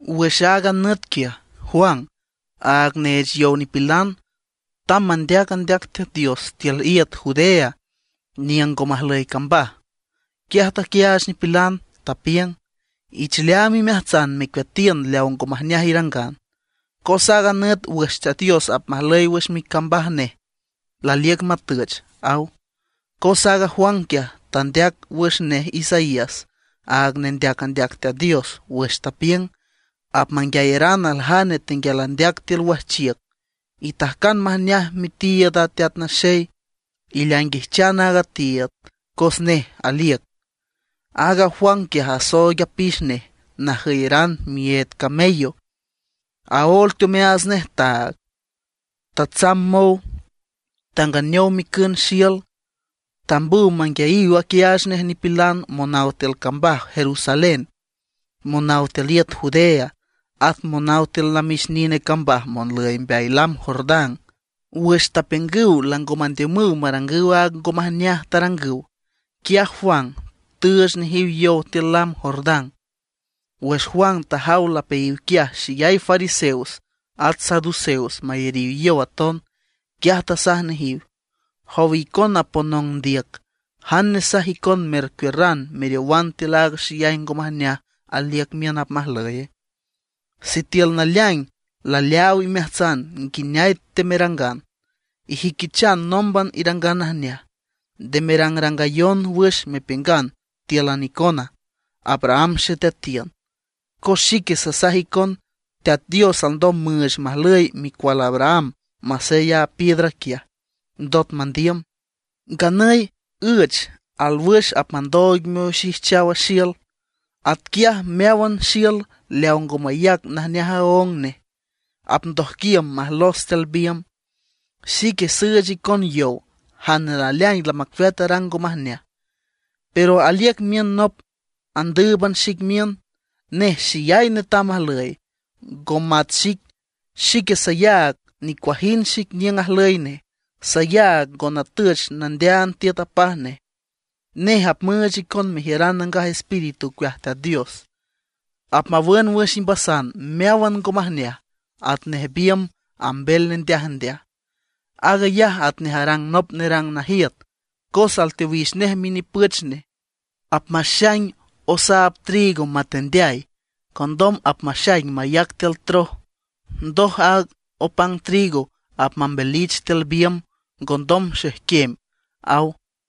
Wüx aaga nüt quiaj, Juan, aaga neech yow nipilan, tamb mandeac andeac Teat Dios tiül iüt Judea niüng ngo majlüy cambaj. Quiaj taquiaach nipilan, tapiüng: ―Ich leaam imeajtsan mecueatiün leaw ngo majneaj irangan, cos aaga nüt wüx Teat Dios apmajlüy wüx micambaj nej laliüc matüch ―aw. Cos aaga Juan quiaj, tandeac wüx nej Isaías, aaga nendeac andeac Teat Dios, wüx tapiüng: Apmanguiayaran aljane tenguial andeac tiül wajchiüc: “Itajcan majneaj mitiiüd a Teat Naxey; ileainguijchan a tiiüd cos nej aliüc.” Aaga Juan quiaj asooig apix nej najüyeran miyeed camello, aóel teomeaats nej taag. Tatsamb mow, tanganeow micün xiül. Tambüw manguiayiw aquiaach nej nipilan monaw tiül cambaj Jerusalén, monaw tiül iüt Judea, at monaw tiül namix nine cambaj monlüy mbeay lam Jordán. Wüx tapiüngüw lango mandiümüw marangüw aaga ngo majneaj tarangüw, quiaj Juan tüüch nejiw yow tiül lam Jordán. Wüx Juan tajaw lapeayiw quiaj xeyay fariseos at saduceos mayariw yow aton, quiaj tasaj nejiw: ―¿Jowa icona ponong ndiüc, jane nesaj icon mercuiürran meriowan tiül aaga xeyay ngo majneaj aliüc miün apmajlüye? Sitiül naleaing laleaaw imeajtsan nguineay temerangan, ijüiquichan nómban irangan najneaj. Nde merangrangayon wüx mepiüngan tíülan icona: “Abraham xeteatiün”; cos xique sasaj icon Teat Dios alndom müüch majlüy micual Abraham masey a piedra quiaj, ndot mandiüm. Nganüy üech alwüx apmandooig mioxijchaw xiül; atquiaj meáwan xiül leaw ngo mayac najneaj aóng nej, apndojquiüm majlos tiül biümb. Xique süüch icon yow jane naleaing lamacueat arang ngo majneaj. Pero aliüc miün nop andǘüban xic miün, nej xeyay netam ajlüy, ngo mat xic. Xique sayaag nicuajind xic niüng ajlüy nej; sayaag ngo natüch nandeaand tiüt apaj nej. Nej apmüüch icon mejiüran Nangaj Espíritu ocueaj Teat Dios. Apmawün wüx imbasan meáwan ngo majneaj atnej biümb ambel nendeajndeaj. Aag ayaj atnej arang nop nerang najiüt, cos alteowix nej minipüch nej, apmaxaing osaab trigo matendeay, condom apmaxaing mayac tiül troj. Ndoj aaga opang trigo apmambelich tiül biümb ngondom xejquem ―aw.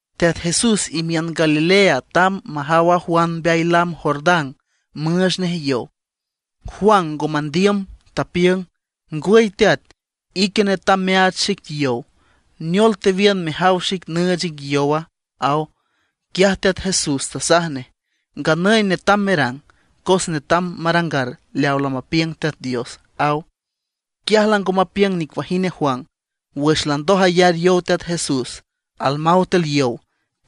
Teat Jesús imiün Galilea tamb majaw a Juan mbeay lam Jordán, müüch nej yow. Juan ngo mandiüm, tapiüng: ―Ngwüy Teat, ique netam meaach xic yow; ¿neol tewiün mejaw xic nüüch ic yowa? ―aw. Quiaj Teat Jesús tasaj nej: ―Nganüy netam merang, cos netam marangar leaw lamapiüng Teat Dios ―aw. Quiaj lango mapiüng nicuajind a Juan. Wüx landoj ayar yow Teat Jesús, almaw tiül yow,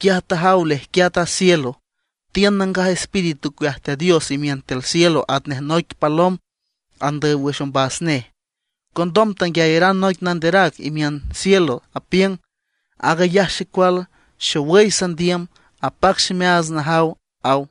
quiaj tajaw lejquiat a cielo, tiün Nangaj Espíritu ocueaj Teat Dios imiün tiül cielo atnej noic palom andüy wüx ombas nej. Condom tanguiayaran noic nanderac imiün cielo, apiüng: ―Aag ayaj xecual xowüy sandiüm, apac ximeaats najaw ―aw.